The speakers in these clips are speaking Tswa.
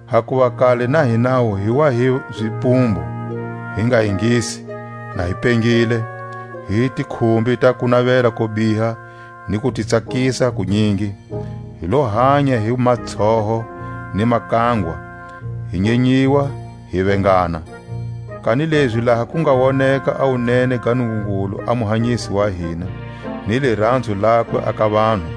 Hakuva kale na hinawu hi wa hi zipumbu, hi nga ingisi, na hi pengile, hi hi tikhumbi ta kunavela ko biha ni kutitsakisa kunyingi; hi lo hanya hi matshoho ni makangwa, hi nyenyiwa, hi vengana. Kanilezi laha ku nga woneka a wunene ga Nungungulu a Muhanyisi wa hina, ni liranzo lakwe a ka vanhu,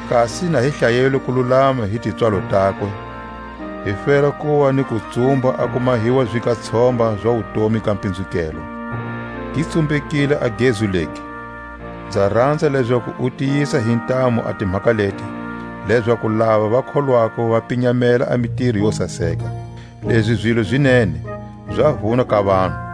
kasi na hi hlayelwe kululama hi tipswalo takwe, hi fela kuva ni kutsumba a ku mahiwa zigatshomba za wutomi ga pinzukelwa. Gi tsumbekile a gezu legi; nza ranza lezaku u tiyisa hi ntamu a timhaka leti, lezaku lava va kholwako va pinyamela a mitiro yo saseka. Lezi zilo zi nene, za vuna ka vanhu.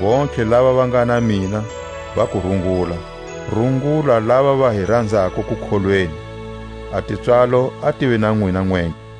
Vontlhe lava va nga na mina va ku rungula. Rungula lava va hi ranzako kukholweni. A tipswalo a tive na nwina nwentlhe.